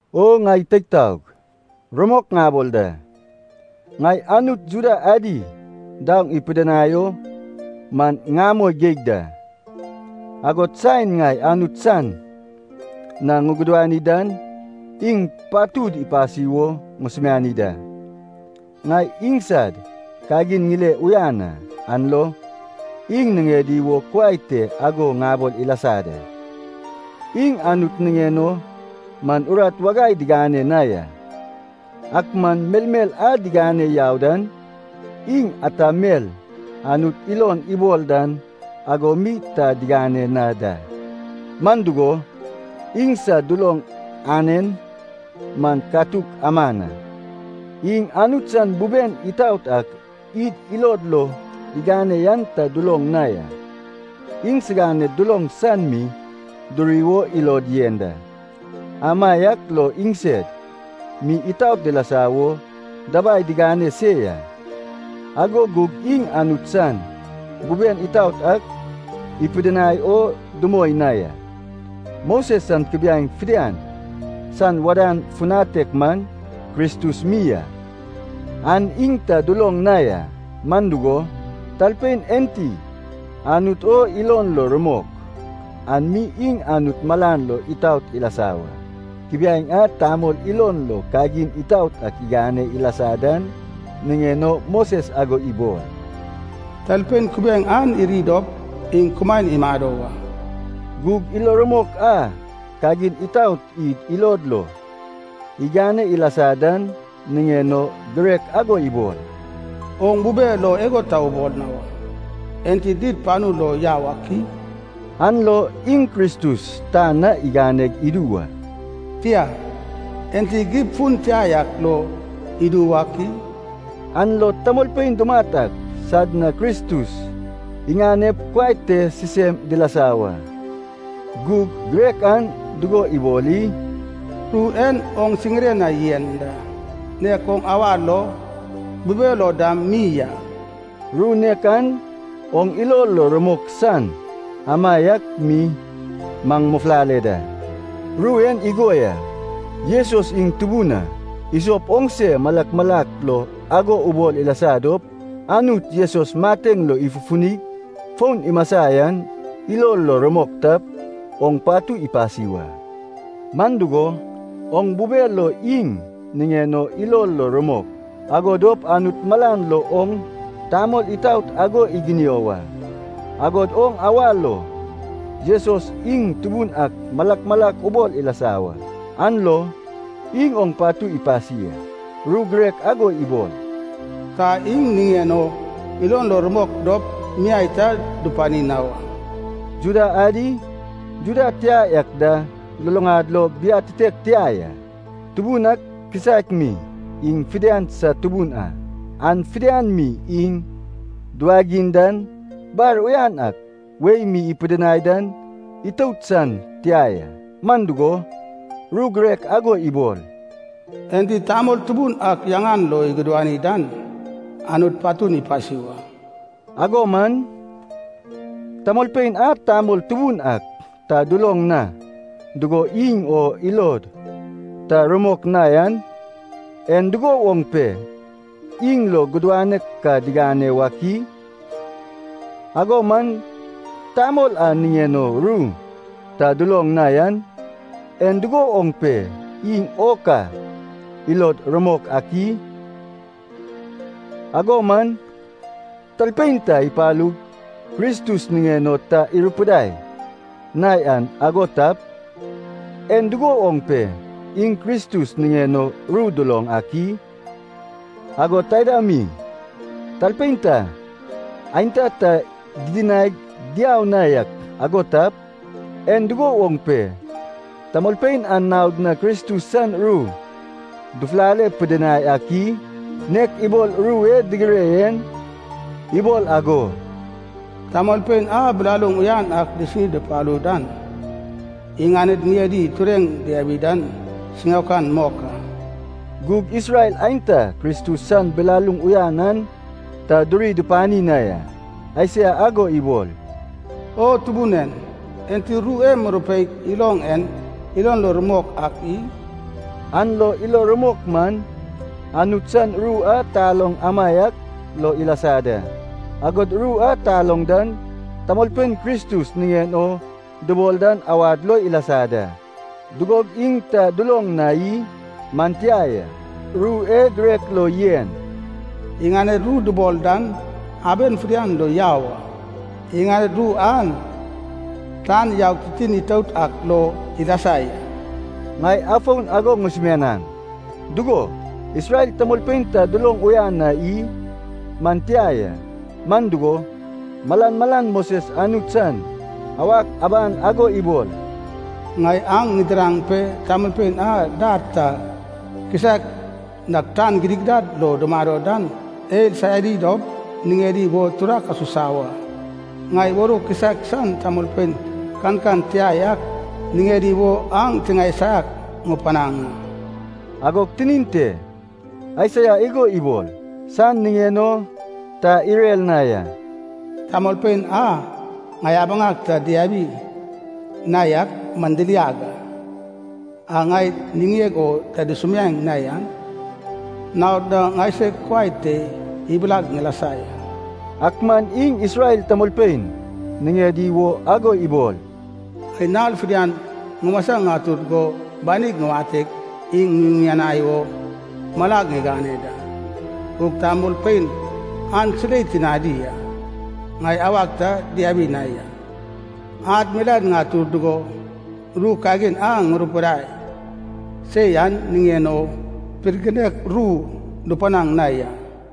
O ŋai teig taog, rumok ŋabol da, ŋai Anut Juda adi daoŋ ipidinai o man ŋamoi geig da. Agod saen ŋai Anut san na ŋugudani dan iŋ patud ipasi wo ŋusumiani da. Ŋai iŋsad kagin ŋile uyan a, an lo iŋ niŋedi wo kuai te ago ŋabol ilasa da, iŋ Anut niŋen o man urat wagai digane na ya. Ak man melmel a digane yau dan, iŋ ata mel Anut ilon ibol dan ago mi ta digane na da. Man dugo, iŋsad duloŋ anen man katuk aman a. Iŋ Anut san buben itaot ak id ilod lo igane yan ta duloŋ na ya. Iŋsiganed duloŋ san mi duri wo ilod yen da, amaiak lo iŋsed mi itaot dilasa wo dabai digane se ya. Ago gug iŋ Anut san buben itaot ak ipidinai o dumoi na ya. Moses san kubiaeŋ fidian san wadan futanek man Kristus mi a, an iŋ ta duloŋ na ya. Man dugo, talpein enti Anut o ilon lo rumok, an mi iŋ Anut malan lo itaot ilasa wa. Kubiaeŋ a tamol ilon lo kagin itaot ak igane ilasa dan niŋen o Moses ago ibol, “Talpein kubiaeŋ an iri dop iŋ kumaen imado wa.” Gug ilo rumok a kagin itaot id ilod lo igane ilasa dan niŋen o girek ago ibol, “Oŋ bube lo igo ta ubol na wa. Enti did panu lo yau ak i?” (an lo iŋ Kristus tan na igane idu wa), “tia, enti gib fun tia yak lo idu wak i?” (an lo tamolpein dumat ak sad na Kristus iŋanep kuai te sisem dilasa wa). Gug girek an dugo ibol i? “Ru en oŋ siŋire na yen da, nek oŋ awa lo, bube lo dam mi a.” Ru nek an oŋ ilo lo rumok san amaiak mi maŋ mufulale da. Ru en igo ya. Jesus iŋ Tubun a, isop oŋse malak malak lo ago ubol ilasa dop, Anut Jesus mateŋ lo ifufunig fon imasa yan ilo lo rumok tap, oŋ patu ipasi wa. Man dugo, oŋ bube lo iŋ niŋen o ilo lo rumok, ago dop Anut malan lo oŋ tamol itaot ago iginio wa. Agod oŋ awa lo Jesus iŋ Tubun ak malak malak ubol ilasa wa, an lo iŋ oŋ patu ipasi a. Ru girek ago ibol, “Ta iŋ niŋen o ilon lo rumok dop miai ta dupani na wa.” Juda adi Juda tia yak da luluŋad lo biatitek tia ya. Tubun ak kisaek mi iŋ fidian sad Tubun a. An fidian mi iŋ duwagiŋ dan bar uyan ak wei mi ipidinai dan itout san tia ya. Man dugo, ru girek ago ibol, “Enti Tamol Tubun ak yaŋan lo igudani dan, Anut patun ipasi wa.” Ago man, tamolpein a Tamol Tubun ak ta duloŋ na dugo iŋ o ilod ta rumok na yan, en dugo woŋ pe iŋ lo gudanek ka digane wak i? Ago man, Tamol a niŋen o ru ta duloŋ na yan, en dugo woŋ pe iŋ o ka ilod rumok ak i? Ago man, talpein ta ipalug Kristus niŋen o ta irupidai na yak ago tap, en dugo woŋ pe iŋ Kristus niŋen o ru duloŋ ak i? Agod taida mi, talpein ta, aenta ta didinaig diau na yak ago tap, en dugo woŋ pe tamolpein an naod na Kristus san ru dufufale pidinai ak i? Nek ibol ru e digire en ibol ago, “Tamolpein a bilaluŋ uyan ak disini dupalu dan, iŋaned ŋiedi tureŋ diabi dan siŋaokan mok a.” Gug Isrel aenta Kristus san bilaluŋ uyan an ta duri dupani na ya. Aisaia ago ibol, “O Tubun en, enti ru e murupeig iloŋ en ilon lo rumok ak i?” An lo ilo rumok man, Anut san ru a taloŋ amaiak lo ilasa da. Agod ru a taloŋ dan tamolpein Kristus niŋen o dubol dan awad lo ilasa da. Gug ŋai ago ŋabol a. Dugog iŋ ta duloŋ na i? Man tia ya. Ru e girek lo yen, “Iŋaned ru dubol dan, aben fidian lo yau a. Iŋaned ru an tan yaug titin itout ak lo ilasa ya.” Ŋai afon ago ŋusumianaŋ, dugo, Isrel tamolpein ta duloŋ uyan na i? Man tia ya. Man dugo, malan malan Moses Anut san awak aban igo ibol, “Ŋai aŋ ŋidiraŋ pe tamolpein a dar ta kisaek nag tan gidigidad lo dumado dan eil saiadi dop niŋedi wo turak asusa wa. Ŋai warou kisaek san tamolpein kankan tia yak niŋedi wo aŋ tiŋae saiak ŋupanaŋ a.” Agog tinin te Aisaia igo ibol san niŋen o ta irer na ya, “Tamolpein a ŋai abaŋag ta diabi na yak man diliag a. A ŋai niŋeg o ta dusumiaeŋ na yan naod na ŋaiseg kuai te ibilag ŋilasa ya.” Ak man iŋ Isrel tamolpein niŋedi wo ago ibol, “Ŋai nal fidian ŋumasa ŋatur go banig ŋuwateg iŋ ŋuyuŋanai wo malag ŋigane da. Gug tamolpein an silei tinadi a, ŋai awag ta diabi na ya. Ad milaen ŋatur dugo, ru kagin a ŋurupidai se yan niŋen o pirginek ru dupanag na ya.”